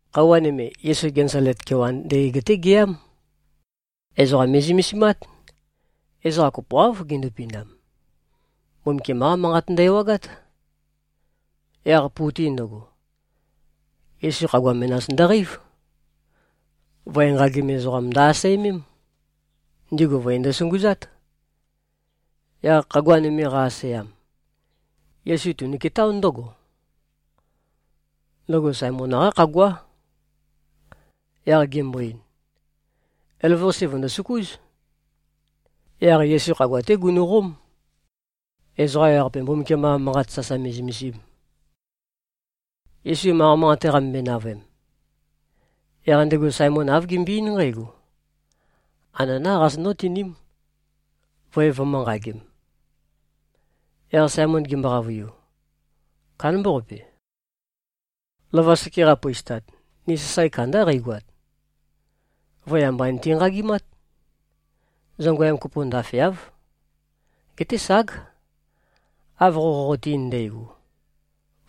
Khøuwa nøme, Yesu Genesalet kewan ndøgeg-té geyám. Ezoqa me꞉zømesimát. Ezoqa kopoáv gindupindam. Mbumbukiam-qá Manqat ndø-ewagát. Yaq pu-te ndøgo, Yesu khagua menas ndøqeív. Voe nqagim ezoqam ndø-asæmém. Ndigu voe ndøsunguzát. Yaq khagua nøme qa-asæam, Yesu tunuketáo ndǿgo. Ndøgo Saemon-qá khaguá. Yaq gembo-ein, “Elavøqase vø̀ndosøkúz.” Yaq Yesu khagua-té gunu꞉qóm, ezoqa ewaqape Mbumbukiam-qa Manqat sasa me꞉zømesim. Yesu manqa manqate qamømbøe-navøem, yaq ndego Saemon āv gembøe-eín nqǽgo, “Ananá qazonǿ-tiním, voe vømø̄-nqagem.” Yaq Saemon gembo-qavøiu, “Kándambaqape. Lova seke qapøistat, ni sasae kandá qeigoat. Voe amba niti-nqagimát. Zongøyam kopo ndafeáv. Geté ság, av qo qoqote-ein ndægo,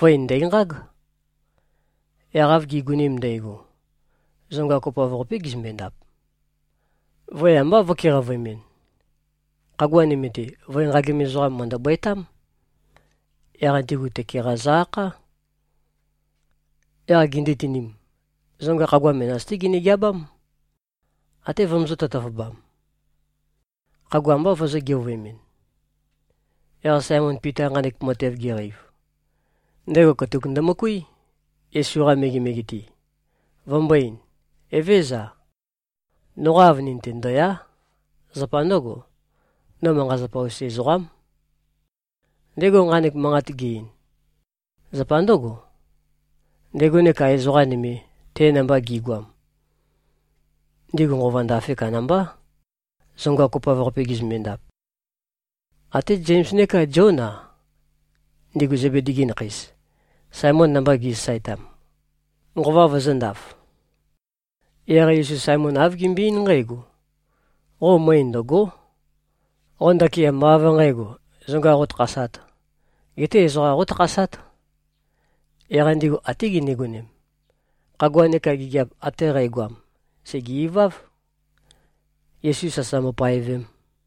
voe ndæ̀nqág.” Yaq av gi꞉gonem ndægo, zonga kopoav-qapé gizømbe-ndap. Voe ambá vø̄keqavøemɨn. Khagua nøme-te, voe nqagim ezoqa nøme mø̀ndøbøetám. Yaq ndigu tøke-qa zø-akhá. Yaq gindutinim, zonga khagua menas-té ginø-geabám, até vømøzø̄-tøtøvøbam. Khagua ambá vøzø̄-geovøemɨn. Yaq Saemon Pita, nqanek matev geqeiv, ndego katuk ndømøkuí, Yesu-qa megemege-te, vømbō-ein, “Evézøza. Noqa avønin-te ndø̀ya᷄. Zapa ndǿgo, no manqa-zapa-us ezoqám.” Ndego nqanek manqat ge-ein, zapa ndǿgo: Ndego neka ezoqa nøme, te namba gi꞉goam, ndigu nqova ndafe kandambá, zonga kopoav-qape gizømbe-ndap. Até Zems neka Zión-a, ndigu Zebedi-gi nakheis, Saemon namba gi꞉sasaetam, nqova vøzø̄ndaf. Yaq Yesu Saemon āv gembøe-eín nqǽgo, “Qo møe ndø̀go᷄. Qo ndakin ambá av nqǣgo, zonga qótakhasāt, geté ezoqa qótakhasát.” Yaq ndigu até gindigonem, khagua neka gigiap ate qægoam, sège-iváv, Yesu sasa mbopaevem.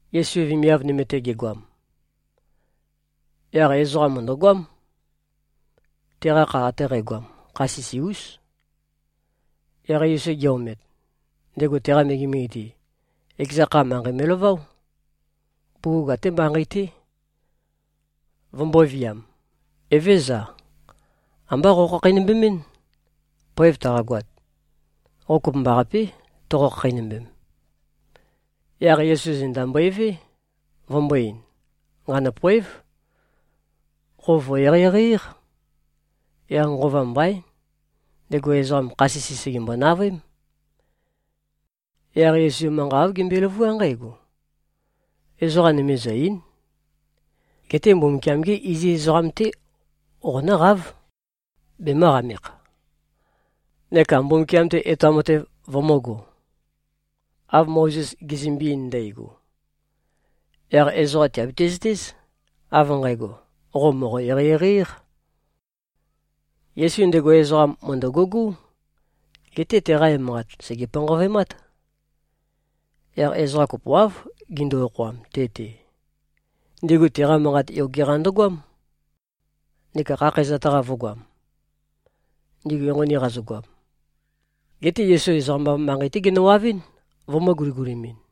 Yesu vemiav nøme-te gegoam, yaq ezoqa mø̀ndøgoám. Teqa kha ate qægoam, kha sisi-ús. Yaq Yesu ge-omet, ndego teqa megemege-te, ekeza kha, manqei me꞉laváo, bugug até manqei-té, vømbōviam, “Evézøza. Ambá qokhakheinømbemín. Poev taqagoat, qo kopømbaqapé, toqo-khakheinømbem.” Yaq Yesu zenda mbøevé, vømbō-ein, “Nqanø̂poév. Qo vø̀-eqeieqei-éq.” Yaq nqova mbaín, ndego ezoqam, kha sisi sègembo-navøém. Yaq Yesu manqa āv gembøe-løvuá nqǽgo, “Ezoqa nøme zø̀-ei᷄n. Geté Mbumbukiam-gé iziz ezoqam-té qonǿqáv, bemø̄qamekh, neka Mbumbukiam-te etoam matev vømø̄go, av Mozes gezømbe-ein ndægo. Yaq ezoqa tìabiti-zøtéz, av nqægo, qo mòqo-eqeieqei-éq.” Yesu ndego ezoqam mø̀ndøgugú, geté teqa emanqat sège-panqavøemát. Yaq ezoqa kopoáv gindu-okhoam te-te. Ndigu teqa manqat yoge-qa ndøgoám, neka khakhæzat-qa vø̄goam, ndigu enqoni qazøgoam. Geté Yesu ezoqam-av manqei-té genøwavɨ́n, vømø̄-guligulimin.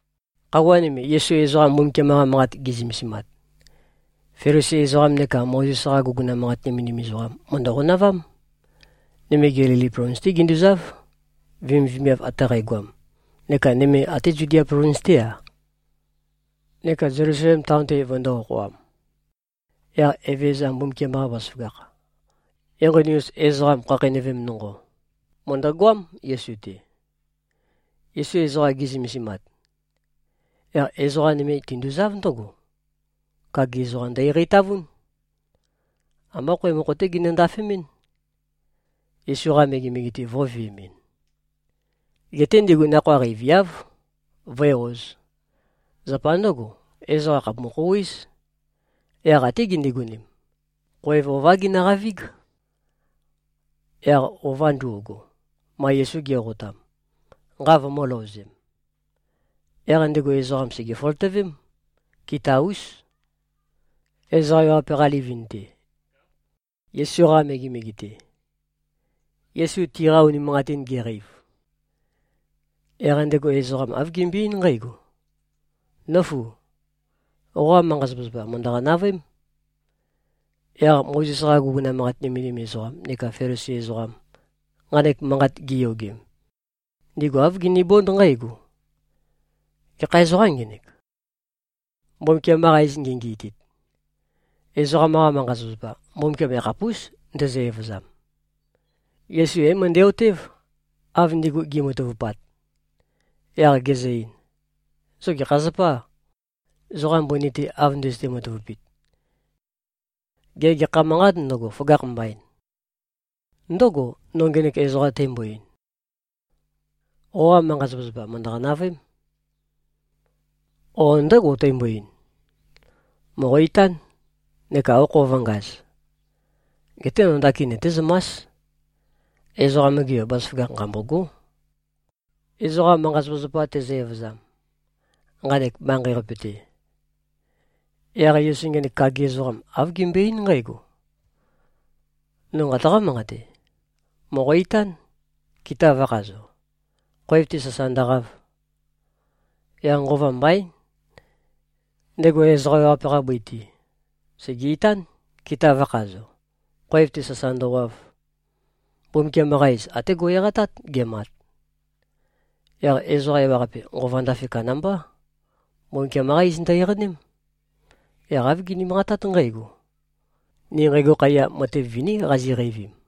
Khøuwa nøme, Yesu ezoqa Mbumbukiam-qa Manqat ge꞉zømesimat, Felisi ezoqam neka Mozes-qa guguna manqat nømendim ezoqam, mø̀ndø-qonavám. Nøme Gelili plovins-té ginduzáv, vemivemiav ate qægoam, neka nøme até Zudia plovins-té-a neka Zelusalem taon-te vøndō-okhoam. Yaq Evezøza Mbumbukiam-qa bazaføgakh, enqoni-us ezoqam khakheinøvem nonqo, mø̀ndøgoám, Yesu-te. Yesu ezoqa ge꞉zømesimat, yaq ezoqa nøme tinduzáv ndǿgo. Kagi ezoqam ndø-eqeitavún. Ambá khoev mokho-té ginø-ndafemɨ́n, Yesu-qa megemege-te vō꞉veemɨn. Geté ndigu nakhoa qeiviáv, vǿe-ōz. Zapa ndǿgo, ezoqa khàpumu-khouwéz. Yaq até gindigonem, khoev ová ginøqavíg, yaq ova ndo꞉go, ma Yesu ge꞉qotam, nqa vømø̄-løozem. Yaq ndego ezoqam sège-føløtøvém, kita-ús, ezoqa ewaqape-qa livin-te, Yesu-qa megemege-te. Yesu tiqa unimanqatin geqeiv, yaq ndego ezoqam āv gembøe-eín nqǽgo, “Nǿfu! Qoqa manqa-zapazapa, mø̀ndøqa-navøém.” Yaq Mozes-qa guguna manqat nømendim ezoqam neka Felisi ezoqam, nqanek manqat giyogem, ndigu āv ginibónd nqǽgo, “Gekha ezoqâm ngenek, Mbumbukiam-qa iz ngengenøitit? Ezoqam-qa manqa-zapazapa, Mbumbukiam yakhapús, ndezø-evøzam.” Yesu é-møndæ-otév, av ndigu gi꞉matavupat. Yaq gezø-ein, “Zo gekha zapâ, zoqa mbøni-te av ndøzøte-matavupit? Gê, gekha manqât ndøgo, føgakh mbain? Ndǿgò, no ngenek ezoqam tæmbo-ein, ‘Qoqa manqa-zapazapa mø̀ndøqa-navøēm,’ o ndǿgò, tæmbo-ein, ‘Mòqo-itán, neka okho vø̄ngaz’? Geté no ndakin nøtézømás, Ezoqam-ge Yo, bazaføgakh nqambôgó, ezoqa manqa-zapazapa tezø-evøzam, nqanek manqei-qape-te.” Yaq Yesu ngenek kagi ezoqam, āv gembøe-eín nqǽgo, “No nqataqá-manqate. Mòqo-itán, kita vø̄khazo, khoev-te sasa ndøqav.” Yaq nqova mbaín. Ndego ezoqa ewaqape-qa bøi-te, sège-itán, kita vø̄khazo, khoev-te sasa ndøwav. Mbumbukiam-qa iz até go꞉-eqatát, gemat. Yaq ezoqa ewaqape, nqova ndafe kandambá. Mbumbukiam-qá iz ndø-eqaném. Yaq āv gini-manqatát nqǽgo, “Ni nqægo khaiya, matev viní qaziqeivim.”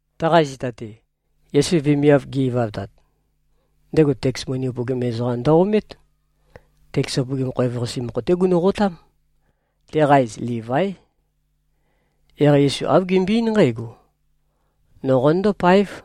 Taqa zita-te, Yesu vemiav ge꞉-ivavtat, ndego teks moni upøgim ezoqam ndø-omét. Teks upøgim khoev-qase mokho-té gunu꞉qotám. Teqa iz Livái. Yaq Yesu āv gembøe-eín nqǽgo, “No qonøndó-páev.”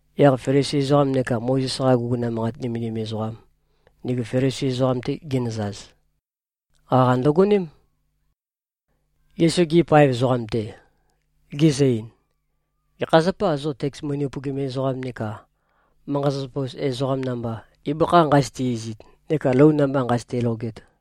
Yaq Felisi ezoqam neka Mozes-qa guguna manqat nømendim ezoqam, ndigu Felisi ezoqam-te ginøzaz, qaqa ndøgoném, Yesu-gi paev ezoqam-te, gizø-ein, “Gekha zapâ, zo teks moni upøgim ezoqam neka manqa-zapazapa-us ezoqam namba, ibøkha nqazøte-izit neka lou namba nqazøte-loget?”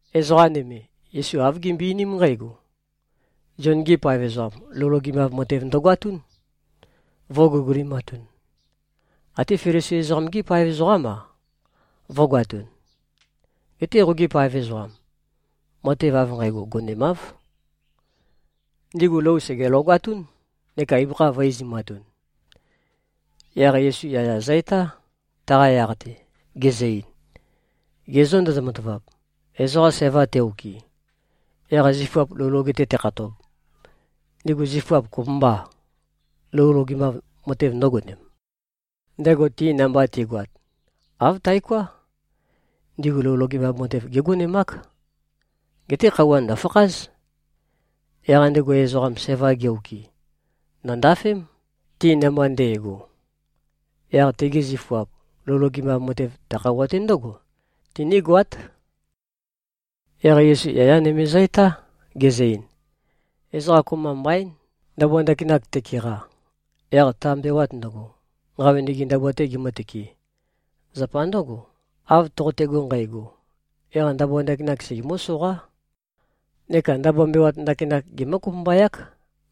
Ezoqa nøme, Yesu āv gimbøe-einím nqǽgo, “Zion-gi paev ezoqam, lou logemav matev ndøgoatún, vø̄guligulimatun. Até Felisi ezoqam-gi paev ezoqám-a, vø̄goatun. Geté qogi paev ezoqam, matev av nqægo gonemáv. Ndigu lou sège-logatún, neka ibøkha vø̄-izumatun.” Yaq Yesu yaya zø-etá, taqa yaq-te, gezø-ein, “Ge zô ndozo-matavap, ezoqa sæva te-okɨ, yaq zifuap lou loge-te tekhatob, ndigu zifuap kopømbâ, lou logemav matev ndø̄gonem, ndego ti namba ti꞉goat? Āv taoká. Ndigu lou logemav matev gégonemák. Geté khøuwa ndø̀fakház. Yaq ndego ezoqam, sævam ge-okɨ, ndø̀ndafém, ti namba nde꞉go. Yaq tegi zifuap lou logemav matev, ta khøuwa-te ndǿgo tinígoát.” Yaq Yesu yaya nøme zø-etá, gezø-ein, “Ezoqa kopømba mbaín, ndabua ndakinak tekeqa, yaq ta mbewat ndøgo, nqawønege ndabua-tē gemǿtøkē. Zapa ndǿgo, av toqotego nqægo, yaq ndabua ndakinak segemǿ-soqá, neka ndabua mbewat ndakinak gemǿ-kopømbayák,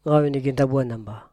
nqawønege ndabua namba.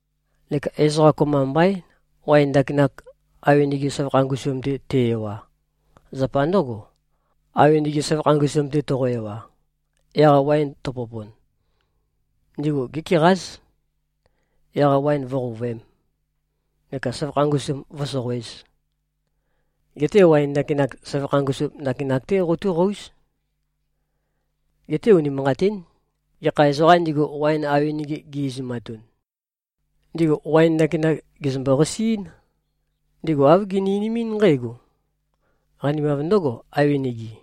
Neka ezoqa kopømba mbaín, waen ndakinak, awenege søvakha ngusum-te te-ewa. Zapa ndǿgo, awenege søvakha ngusum-te toqo-ewa, yaq waen tøpopon, ndigu gékeqáz. Yaq waen vǿqouvøēm, neka søvakha ngusum vǿsoqoēz. Geté waen ndakinak, søvakha ngusum ndakinak-té qotúqóuz. Geté unimanqatín, gekha ezoqām ndigu, waen awenege gi-izumatun, ndigu waen ndakinak gèzømbo-qasiín. Ndigu āv gini-einimín nqǽgo, ‘Qanimav ndǿgo, awenege.’”